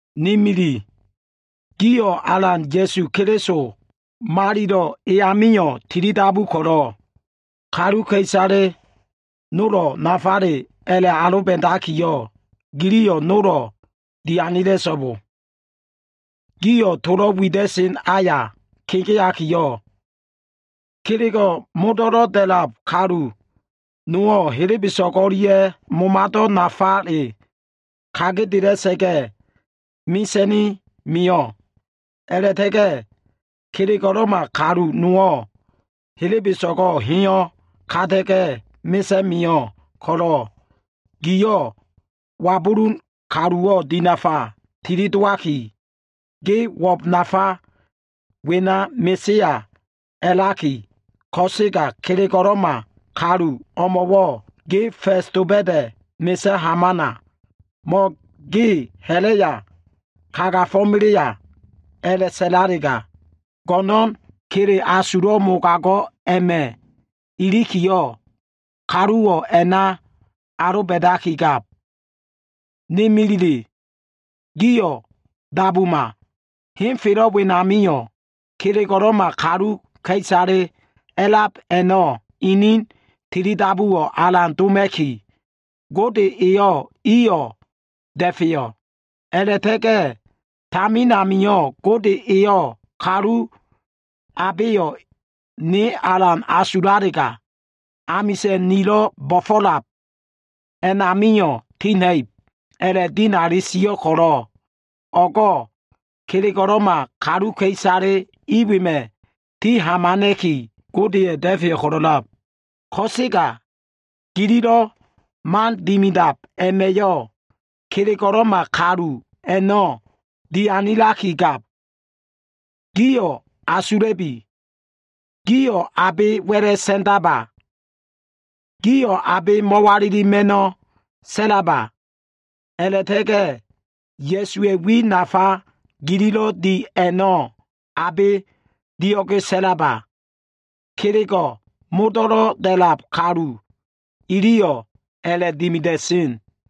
Ni mili, gio꞉ Alan Ya꞉su Keliso malilo꞉ e amio꞉ tilidabu ko꞉lo꞉, kaluka꞉isale nolo꞉ nafale a꞉la꞉ aloba꞉dakiyo꞉, giliyo꞉ nolo꞉ dianila꞉so꞉bo. Gio꞉ tolo꞉ wida꞉sen aya kegeakiyo꞉, kelego꞉ modo꞉lo꞉ da꞉lab kalu nowo꞉, helebeso꞉go꞉ o꞉lia꞉ momado꞉wo꞉ nafale kagedela꞉sa꞉ga꞉ mesa꞉ni mio꞉. A꞉la꞉ta꞉ga꞉ kelego꞉lo꞉ma kalu nowo꞉ helebeso꞉go꞉ heyo꞉ kata꞉ga꞉ mesa꞉ni mio꞉ ko꞉lo꞉, giyo꞉ wabulun kaluwo꞉ dinafa tilidowaki, “ge uwo꞉b nafa wena mesea” a꞉laki, ko꞉sega kelego꞉lo꞉ma kalu o꞉mo꞉wo꞉ “ge fa꞉s doba꞉da꞉ mesa꞉ hamana” mo꞉ “ge ha꞉la꞉ya kagafo꞉melea” a꞉la꞉sa꞉lalega, go꞉no꞉n kele asulo꞉ mogago꞉ a꞉ma꞉ ilikiyo꞉, kaluwo꞉ a꞉na aloba꞉dakigab. Ni milile, gio꞉ dabuma. Henfelo꞉ wenamio꞉ kelego꞉lo꞉ma kaluka꞉isale a꞉lab a꞉no꞉ ini tilidabuwo꞉ alan doma꞉ki, Gode eyo꞉ iyo꞉ da꞉feyo꞉. A꞉la꞉ta꞉ga꞉ tamin amio꞉ Gode eyo꞉ “kalu abeyo꞉ ne alan asulalega, amisa꞉n nilo꞉ bo꞉fo꞉lab a꞉namio꞉ tina꞉ib” a꞉la꞉dinali sio꞉ ko꞉lo꞉, o꞉go꞉ kelego꞉lo꞉ma kaluka꞉isale i wema꞉ ti hamana꞉ki, Godeya꞉ da꞉feyo꞉ ko꞉lo꞉lab. Ko꞉sega gililo꞉ man dimidab a꞉ma꞉yo꞉, kelego꞉lo꞉ma kalu a꞉no꞉ dianilakigab. Gio꞉ asula꞉bi. Gio꞉ abe wa꞉la꞉ sa꞉ndano꞉? Gio꞉ abe mo꞉walilano꞉? A꞉la꞉ta꞉ga꞉ Ya꞉suwa꞉ wi nafa gililo꞉ di a꞉no꞉ abe dio꞉ge sa꞉la꞉leno꞉? Kelego꞉ modo꞉lo꞉ da꞉lab kalu iliyo꞉ a꞉la꞉dimida꞉sen.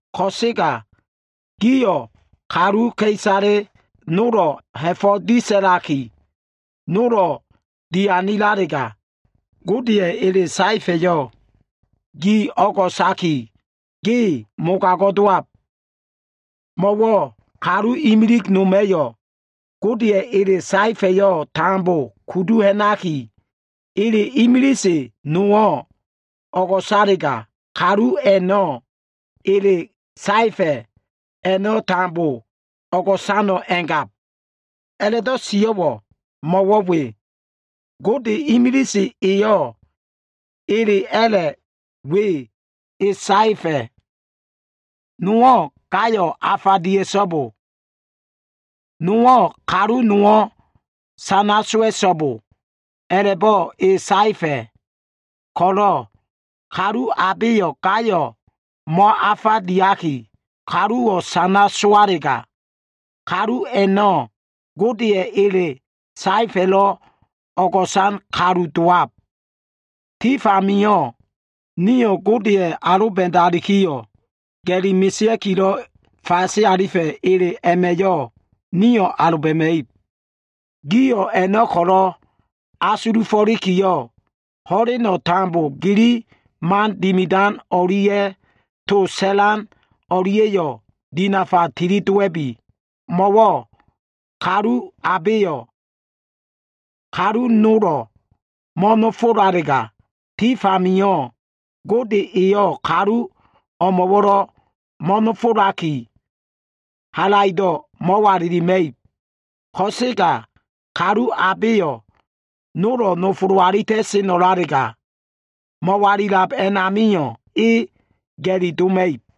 Ko꞉sega giyo꞉ kaluka꞉isale nolo꞉ ha꞉fo꞉ disa꞉laki, nolo꞉ dianilalega, Godeya꞉ ele saefa꞉yo꞉ gi o꞉go꞉saki, ge mogago꞉ dowab. Mo꞉wo꞉ kalu imilig noma꞉yo꞉ Godeya꞉ ele saefa꞉yo꞉ tambo kudu ha꞉naki, ele imilise nowo꞉ o꞉go꞉salega, kalu a꞉no꞉ ele saefa꞉ a꞉no꞉ tambo o꞉go꞉sano꞉ a꞉ngab. A꞉la꞉do꞉ sio꞉wo꞉ mo꞉wo꞉ we. Gode imilise eyo꞉ ele a꞉la꞉ we e saefa꞉. Nowo꞉ “gayo꞉ afa dia꞉so꞉bo.” Nowo꞉ “kalu nowo꞉ sana sowa꞉so꞉bo,” a꞉la꞉bo꞉ E saefa꞉ ko꞉lo꞉, kalu abeyo꞉ gayo꞉ mo꞉afa diaki, kaluwo꞉ sana sowalega, kalu a꞉no꞉ Godeya꞉ ele saefa꞉lo꞉ o꞉go꞉san kalu dowab. Tif amio꞉ nio꞉ Godeya꞉ aloba꞉dalikiyo꞉, ga꞉li mesea꞉kilo꞉ fase alifa꞉ ele a꞉ma꞉yo꞉ nio꞉ aloba꞉ma꞉ib. Gio꞉ a꞉no꞉ ko꞉lo꞉ asulufo꞉likiyo꞉, ho꞉leno꞉ tambo gili man dimidan o꞉lia꞉ to sa꞉lan o꞉lia꞉yo꞉ dinafa tilidowa꞉bi. Mo꞉wo꞉ kalu abeyo꞉ kalu nolo꞉ mo꞉nofola꞉lalega, tif amio꞉ Gode eyo꞉ kalu emo꞉wo꞉lo꞉ mo꞉nofolaki, halaido꞉ mo꞉walilima꞉ib. Ko꞉sega kalu abeyo꞉ nolo꞉ nofolo꞉ alita꞉seno꞉lalega, mo꞉walilab a꞉namio꞉ e ga꞉li doma꞉ib.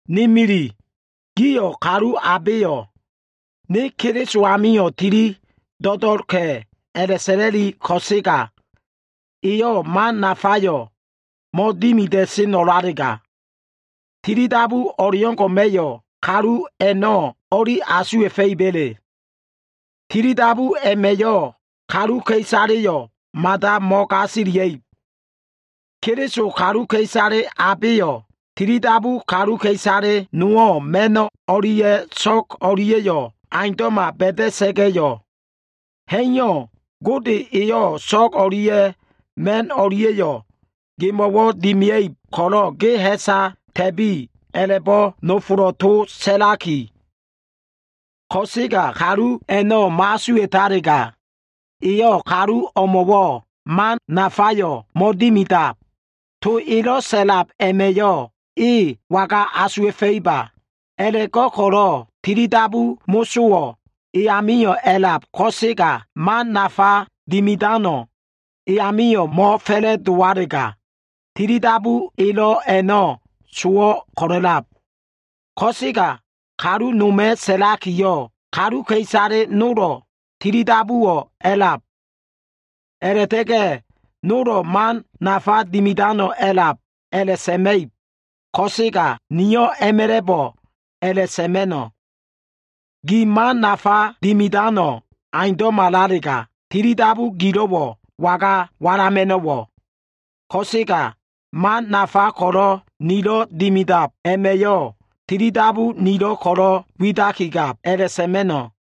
Ni mili gio꞉, kalu abeyo꞉ “Ne Keliso amio꞉ tili do꞉do꞉lka꞉” a꞉la꞉sa꞉la꞉li ko꞉sega, eyo꞉ man nafayo꞉ mo꞉dimida꞉seno꞉lalega, tilidabu o꞉leo꞉ngo꞉ma꞉yo꞉ kalu a꞉no꞉ o꞉li asuwa꞉fa꞉iba꞉le? Tilidabu a꞉ma꞉yo꞉ kaluka꞉isaleyo꞉ mada mo꞉gasilia꞉ib. Keliso kaluka꞉isale abeyo꞉ tilidabu kaluka꞉isale nowo꞉ ma꞉no꞉ o꞉lia꞉ so꞉g o꞉lia꞉yo꞉ aundo꞉ma ba꞉da꞉sa꞉ga꞉yo꞉, “Ha꞉iyo꞉, Gode eyo꞉ so꞉g o꞉lia꞉ ma꞉n o꞉lia꞉yo꞉ gemo꞉wo꞉ dimia꞉ib ko꞉lo꞉ ge ha꞉sa ta꞉bi” a꞉la꞉bo꞉ nofolo꞉ towo꞉ sa꞉laki ko꞉sega, kalu a꞉no꞉ mo꞉asuwa꞉talega, eyo꞉ kalu o꞉mo꞉wo꞉ man nafayo꞉ mo꞉dimidab. To elo꞉ sa꞉lab a꞉ma꞉yo꞉ e waga asuwa꞉fa꞉iba? A꞉la꞉go꞉ko꞉lo꞉ tilidabu mosowo꞉ e amio꞉ a꞉lab ko꞉sega man nafa dimidano꞉ e amio꞉ mo꞉fa꞉la꞉dowalega, tilidabu elo꞉ a꞉no꞉ sowo꞉ ko꞉lo꞉lab. Ko꞉sega kalu noma꞉ sa꞉lakiyo꞉, “Kaluka꞉isale nolo꞉ tilidabuwo꞉ a꞉lab. A꞉la꞉ta꞉ga꞉ nolo꞉ man nafa dimidano꞉ a꞉lab” a꞉la꞉sa꞉ma꞉ib. Ko꞉sega niyo꞉ a꞉ma꞉la꞉bo꞉ a꞉la꞉sa꞉ma꞉no꞉, “Ge man nafa dimidano꞉ aundo꞉malalega, tilidabu gilo꞉wo꞉ waga walama꞉no꞉wo꞉? Ko꞉sega man nafa ko꞉lo꞉ nilo꞉ dimidab a꞉ma꞉yo꞉, tilidabu nilo꞉wo꞉ ko꞉lo꞉ widakigab” a꞉la꞉sa꞉ma꞉no꞉.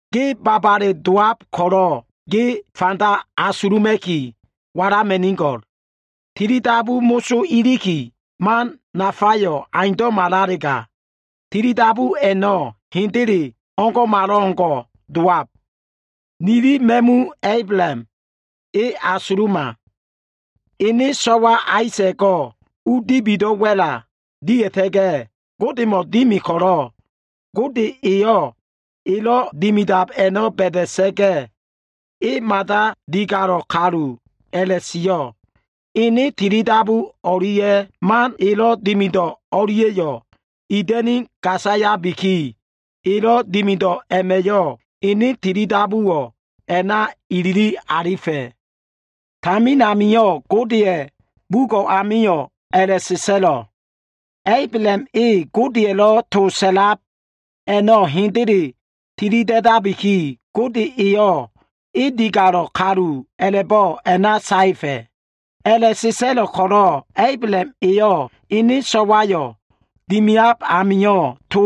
Ge babale dowab ko꞉lo꞉, ge fanda asuluma꞉ki walama꞉nigo꞉l. Tilidabu moso iliki man nafayo꞉ aundo꞉malalega, tilidabu a꞉no꞉ hendele o꞉ngo꞉malo꞉ngo꞉ dowab. Nili ma꞉mu Ablaham e asuluma. Ene so꞉wa Aisa꞉go꞉ u dibido꞉ wa꞉la dia꞉ta꞉ga꞉, Godemo꞉ dimi ko꞉lo꞉ Gode eyo꞉ elo꞉ dimidab a꞉no꞉ ba꞉da꞉sa꞉ga꞉yo꞉, e mada digalo꞉ kalu a꞉la꞉sio꞉. Ene tilidabu o꞉lia꞉ man elo꞉ dimido꞉ o꞉lia꞉yo꞉ ida꞉ni gasayabiki, elo꞉ dimido꞉ a꞉ma꞉yo꞉ ene tilidabuwo꞉ a꞉na ilili alifa꞉. Tamin amio꞉ Godeya꞉ bugo꞉ amio꞉ a꞉la꞉sa꞉sa꞉lo꞉, “Ablaham e Godeya꞉lo꞉ to sa꞉lab a꞉no꞉ hendele tilida꞉dabiki, Gode eyo꞉ e digalo꞉ kalu a꞉la꞉bo꞉ a꞉na saefa꞉.” A꞉la꞉sa꞉sa꞉lo꞉ ko꞉lo꞉ Ablaham eyo꞉ ene so꞉wayo꞉ dimiab amio꞉, to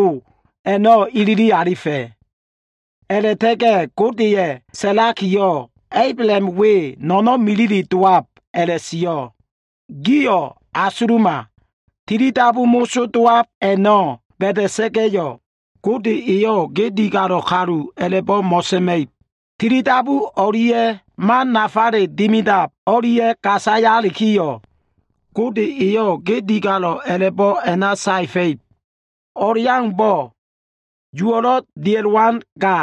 a꞉no꞉ ilili alifa꞉. A꞉la꞉ta꞉ga꞉ Godeya꞉ sa꞉lakiyo꞉, “Ablaham we no꞉no꞉n milile dowab” a꞉la꞉sio꞉. Gio꞉ asuluma. Tilidabu moso dowab a꞉no꞉ ba꞉da꞉sa꞉ga꞉yo꞉, Gode eyo꞉ ge digalo꞉ kalu a꞉la꞉bo꞉ mo꞉sa꞉ma꞉ib. Tilidabu o꞉lia꞉ man nafale dimidab o꞉lia꞉ gasayalikiyo꞉, Gode eyo꞉ ge digalo꞉ a꞉la꞉bo꞉ a꞉na saefa꞉ib. O꞉leaumbo꞉ uwo꞉ diakilo꞉ molelo꞉ dia꞉sen ga,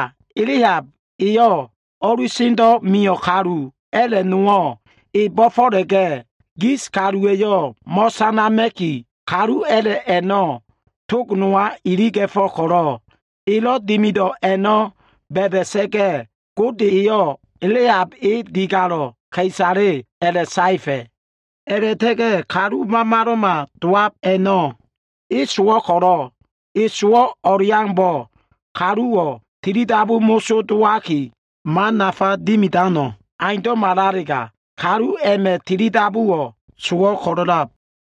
Lehab eyo꞉ o꞉lusendo꞉ mio꞉ kalu a꞉la꞉ nowo꞉ e bo꞉fo꞉la꞉ga꞉, gis kaluwa꞉yo꞉ mo꞉sanama꞉ki, kalu a꞉la꞉ a꞉no꞉ tog nowa iliga꞉fo꞉ ko꞉lo꞉, elo꞉ dimido꞉ a꞉no꞉ ba꞉da꞉sa꞉ga꞉, Gode eyo꞉ Lehab e digalo꞉ ka꞉isale a꞉la꞉saefa꞉. A꞉la꞉ta꞉ga꞉ kalu mamalo꞉ma dowab a꞉no꞉ e sowo꞉ ko꞉lo꞉, e sowo꞉ o꞉leaumbo꞉ kaluwo꞉ tilidabu mosowo꞉ dowaki, man nafa dimidano꞉ aundo꞉malalega, kalu a꞉ma꞉ tilidabuwo꞉ sowo꞉ ko꞉lo꞉lab.